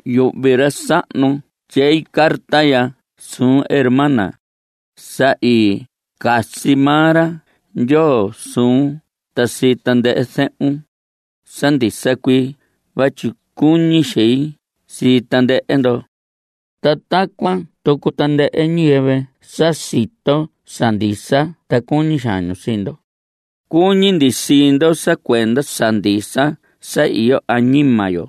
Yuhvi ra sahnu tyei carta ya suun, hermana. Sa i casi maa ra Ndyoo suun ta sii tandɨhɨ zehun. Sa ndisa cuii vatyi cuñi xein sii tandɨhɨ ndo. Ta tacuan tucu tandɨhɨ ñiyɨvɨ sa sito sa ndisa ta cuñi xaan ñu sii ndo. Cuñi ndi sii ndo sa cuenda sa ndisa sa iyo añima yo.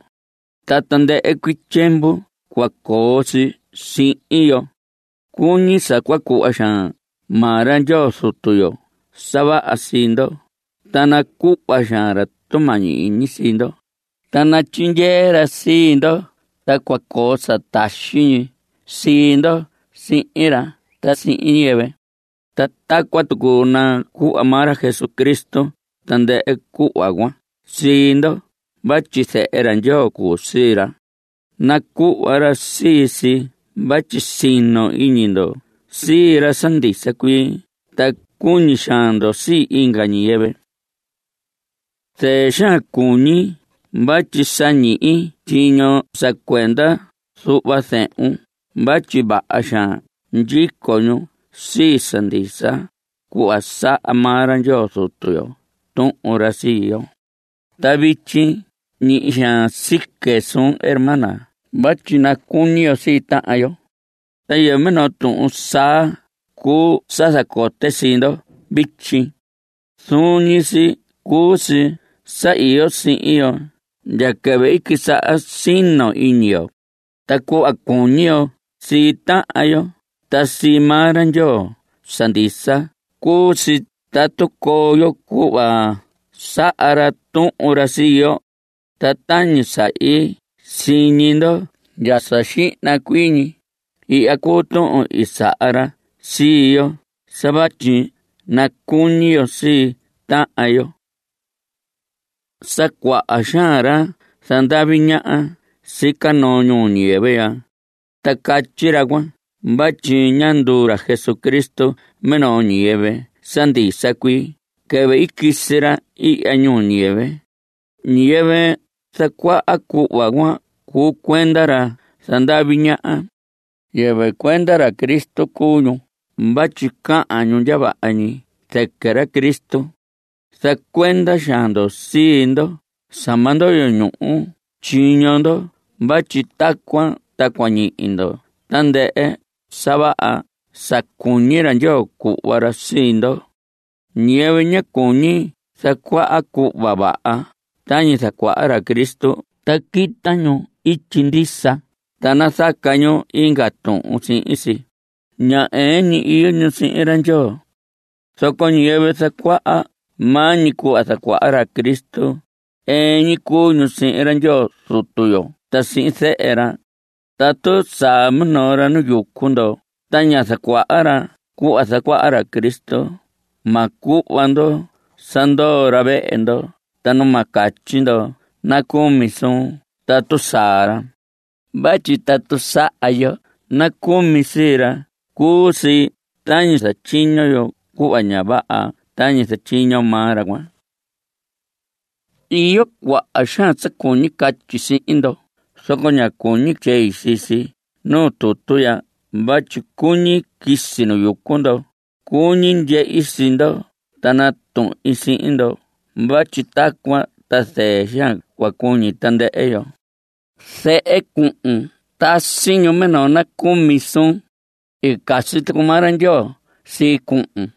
Ta tandɨhɨ cuii tyiemvu cua coo si sihin yo. Cuñi sa cua cuhva xaan maa ra Ndyoo Zutu yo sa vaha sii ndo, ta nacuhva xaan ra tumañi iñi sii ndo, ta natyindyee ra sii ndo ta cua coo sa taxi ñi sii ndo sihin ra ta sihin ñiyɨvɨ. Ta tacuan tucu nacuhva maa ra Jesucristo tandɨhɨ cuhva cuan sii ndo vatyi Zehe Ndyoo cuu sii ra. Nacuhva ra sii si vatyi sino iñi ndo sii ra sa ndisa cuii ta cuñi xaan ndo sii inga ñiyɨvɨ. Zɨɨ xaan cuñi vatyi sa ñihi tyiño sa cuenda zuhva zehun vatyi vaha xaan ndyico ñu sii sa ndisa, cuhva saha maa ra Ndyoo Zutu yo tuhun ra sii yo. Ta vityi ñihi xaan sique suun hermana vatyi nacuñi yo sii tahan yo. Ta yɨvɨ minoo tuhun saa cuu sa zacote sii ndo vityi. Zuun ñi si cuu si sa iyo sihin yo ndya quɨvɨ i quisaha sino iñi yo. Ta cuhva cuñi yo sii tahan yo ta sii maa ra Ndyoo sa ndisa cuu si tatu coo yo cuhva saha ra tuhun ra sii yo. Ta tañi sa i siñi ndo ndya sa xihna cuii ñi, ihya cuu tuhun i saha ra sii yo sa vatyi nacuñi yo sii tahan yo. Sa cuaha xaan ra zandavi ñaha sica noo ñuu ñiyɨvɨ ya. Ta catyi ra cuan vatyi ñá nduu ra Jesucristo minoo ñiyɨvɨ sa ndisa cuii quɨvɨ i quisi ra ihya ñuu ñiyɨvɨ. Ñiyɨvɨ zacuaha cuhva cuan cuu cuenda ra zandavi ñaha. Yɨvɨ cuenda ra Cristo cuu ñu vatyi cahan ñu ndya vaha ñi zɨquɨ ra Cristo. Zacuenda xaan ndo sii ndo sa ma ndoyo ñuhu tyiño ndo vatyi tacuan ta cua ñihi ndo tandɨhɨ sa vaha sa cuñi ra Ndyoo cuhva ra sii ndo. Ñiyɨvɨ ña cuñi zacuaha cuhva vaha tañi zacuaha ra Cristo ta quita ñu ityi ndisa ta nazaca ñu inga tuhun sihin si, ña ɨɨn ñi iyo ñu sihin ra Ndyoo. Zoco ñiyɨvɨ zacuaha maa ñi cuhva zacuaha ra Cristo, ɨɨn ñi cuu ñu sihin ra Ndyoo Zutu yo ta sihin Zehe ra. Tatu saa minoo ra nu yucu ndo ta ña zacuaha ra cuhva zacuaha ra Cristo, ma cuhva ndo sa ndoo ra vehe ndo ta nu ma catyi ndo nacumi suun tatu saa ra. Vatyi tatu saha yo nacumi sii ra, cuu si tañi zatyiño yo cuhva ña vaha tañi zatyiño maa ra cuan. Iyo cuaha xaan sa cuñi catyi sihin ndo, zoco ña cuñi tyei sii si nuu tutu vatyi cuñi quisi nu yucu ndo. Cuñi ndyehi sii ndo ta natuhin sihin ndo vatyi tacuan ta zɨɨ xaan cua cuñi tandɨhɨ yo. Zehe cuhun tasi ñu minoo nacumi suun. I casi tucu maa ra Ndyoo sii cuhun.